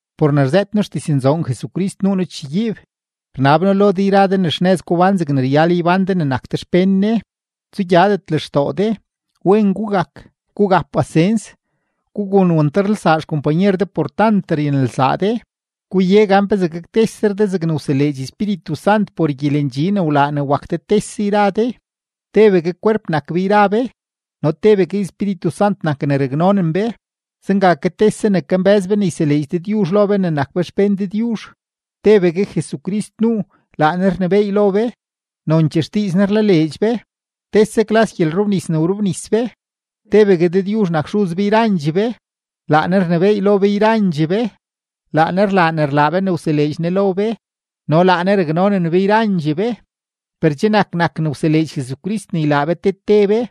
Por ne rzëët noo xdiznzoon Jesucrist nuu noo chegyiib. Rnab noo lo de yra de ne xnëz gubán zegne ryal ybán de ne che nak de xpén Ne. Tsugyadet lextoo de, wen gugak, gugap pasens, gugun wantarlsaa xkompanyer de por tant ryanelsaa de. Guye gan pezee gaktesre de zegne wseleedx Espíritu Sant por gyelendxi ne wlaa ne wak de tese yra de. Tebegue kwerp nak be yra be no tebegue Espíritu Sant nak ne raknonen be, zenga ke tese ne kambë́z be ne yseleedx Dëdyuzh lo be ne nak be xpén Dëdyuzh. Tebegue Jesucrist nuu, laa Ne rnebééy lo be, nonchee xdiiz Ne rlaleedx be, tese klas gyelrobnis ne wrobnis be, tebegue Dëdyuzh nak Xuz be yrandxee be, laa Ne rnebééy lo be yrandxee be, laa Ne rlaa ne rlaa be ne wseleedx Ne lo be, no laa Ne raknonen be yrandxee be. Per che nak nak ne wseleedx Jesucrist ne ylaa be te te be.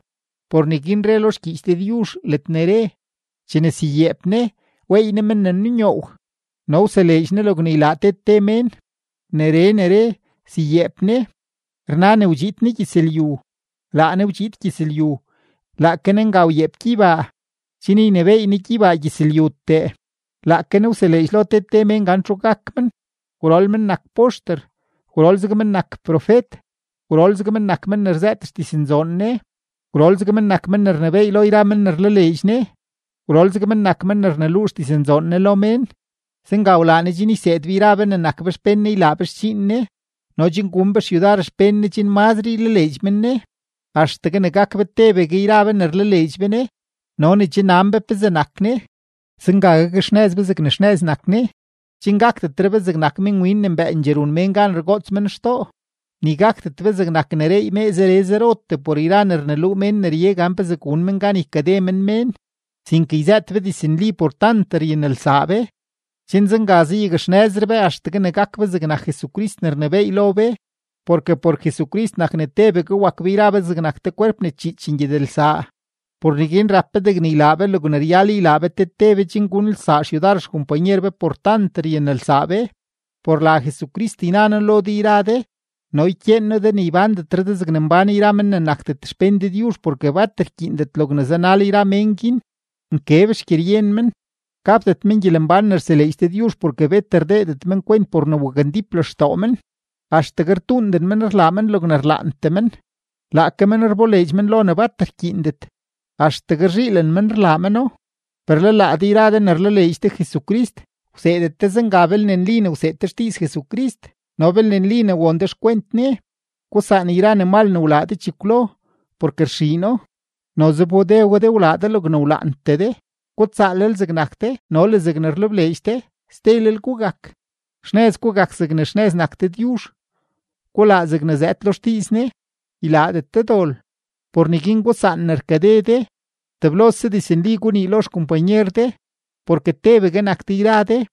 Por neguin re lo xgyiich Dëdyuzh ledne re: Chene syayeep Ne, weey Ne men ne nunyoow, no wseleedx Ne logne ylaa te te mén. Neree ne re “syayeep Ne”, rna ne wdxiid Ne gyëzlyu. Laa Ne wdxiid gyëzlyu, laake Ne nga wyeep gyeybaa, chen ynebééy Ne gyeybaa gyëzlyutee. Laake Ne wseleedx lo te te mén gan txu gak men: gwrol men nak poxter, gwrol zeg men nak profet, gwrol zeg men nak men ne rzëët xdiznzoon Ne, gwrol zeg men nak men ne rnebééy lo yra mén ne rlaleedx Ne, gwrol zeg men nak men ne rneluu xdiznzoon Ne lo mén. Zenga wlaa Ne chen yseed be yra be ne nak be xpén Ne ylaa be xdxiin Ne no chen gun be xyudar xpén Ne chen mazre ylaleedx men Ne, axtegue ne gak be tebegue yra be ne rlaleedx be Ne no ne che nan be pezee nak Ne. Zenga gakxnëz be zegne xnëz nak Ne, chen gakdetre be zegnak minwin ne mbëëndxee run mén gan rgoots men xtoo, ni gakdet be zegnak ne reey mee zere zerotee por yra ne rneluu mén ne rye gan pezee gun men gan ykade men mén, sinke yzëët be diznli por tant ryanelsaa be, chen zenga zayakxnëzre be axtegue ne gak be zegnak Jesucrist ne rnebééy lo be. Porke por Jesucrist nak ne tebegue wak be yra be zegnak te kwerp ne chiich ngyedelsaa. Por neguin rap be degne ylaa be logne ryal ylaa be te te be chen gunelsaa xyudar xkompanyer be por tant ryanelsaa be. Por la Jesucrist yna noo lo de yra de no ykyeen noo de ne ybándetre de zegne mbán yra men ne nakdet xpén Dëdyuzh porke bat rkyiindet logne zanal yra mén guin, nkeb xgyeryen men. Gapdet men gyelembán ne rseleedx Dëdyuzh porke bet rdeedet men kwent por ne wakndíp lextoo men. Axtegue rtuunden men rlaa men logne rlaantee men; laake men rboleedx men lo ne bat rkyiindet, axtegue rzhiilen men rlaa meno. Per le laa de yra de ne rlaleedx de Jesucrist, wseedet de zenga belne nli ne wseed de xdiiz Jesucrist no belne nli ne won de xkwent Ne. Gusaan yra ne mal ne wlaa de chekwlo porke rxiino, noze wbode we de wlaa de logne wlaantee de. Gutsaalel zegnak de no le zegne rlebleedx de. Stelel gugak, xnëz gugak zegne xnëz nak Dëdyuzh; gulaa zegne zëëd lo xdiiz Ne, ylaadet de dol. Por neguin gusaan ne rkade de. Teblose diznli gunii lo xkompanyer de, porke tebegue nak de yra de.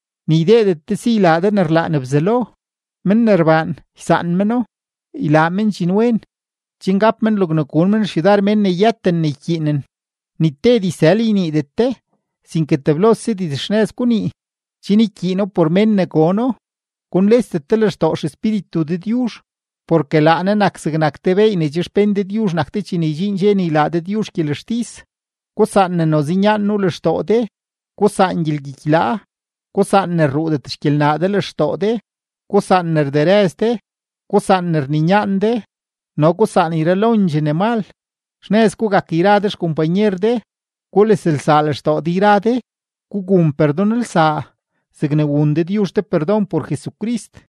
ni ydeedet de si ylaa de ne rlaan Bzelo. Men ne rbaan, ysaan meno, ylaa men dxinwen, chen gap men logne gun men xyudar mén ne yëten ne ykyiinen. Ni te dizsël yniidet de, sinke teblose dizxnëz gunii, chen ykyiino por mén ne gono. Gunlesdet de lextoo XEspíritu Dëdyuzh, porke laa Ne nak zegnak te beey ne che xpén Dëdyuzh nak de chene ydxiin dxe ne ylaa Dëdyuzh gyelextis. Gusaan ne noze nyaan nuu lextoo de, gusaan gyelgyikylaa, gusaan ne rruudet xgyelnaa de lextoo de, gusaan ne rderëz de, gusaan ne rninyaan de, no gusaan yralondxee ne mal. Xnëz gugak yra de xkompanyer de, guleslsaa lextoo de yra de. Gugun perdonlsaa zegne wun Dëdyuzh de perdon por Jesucrist.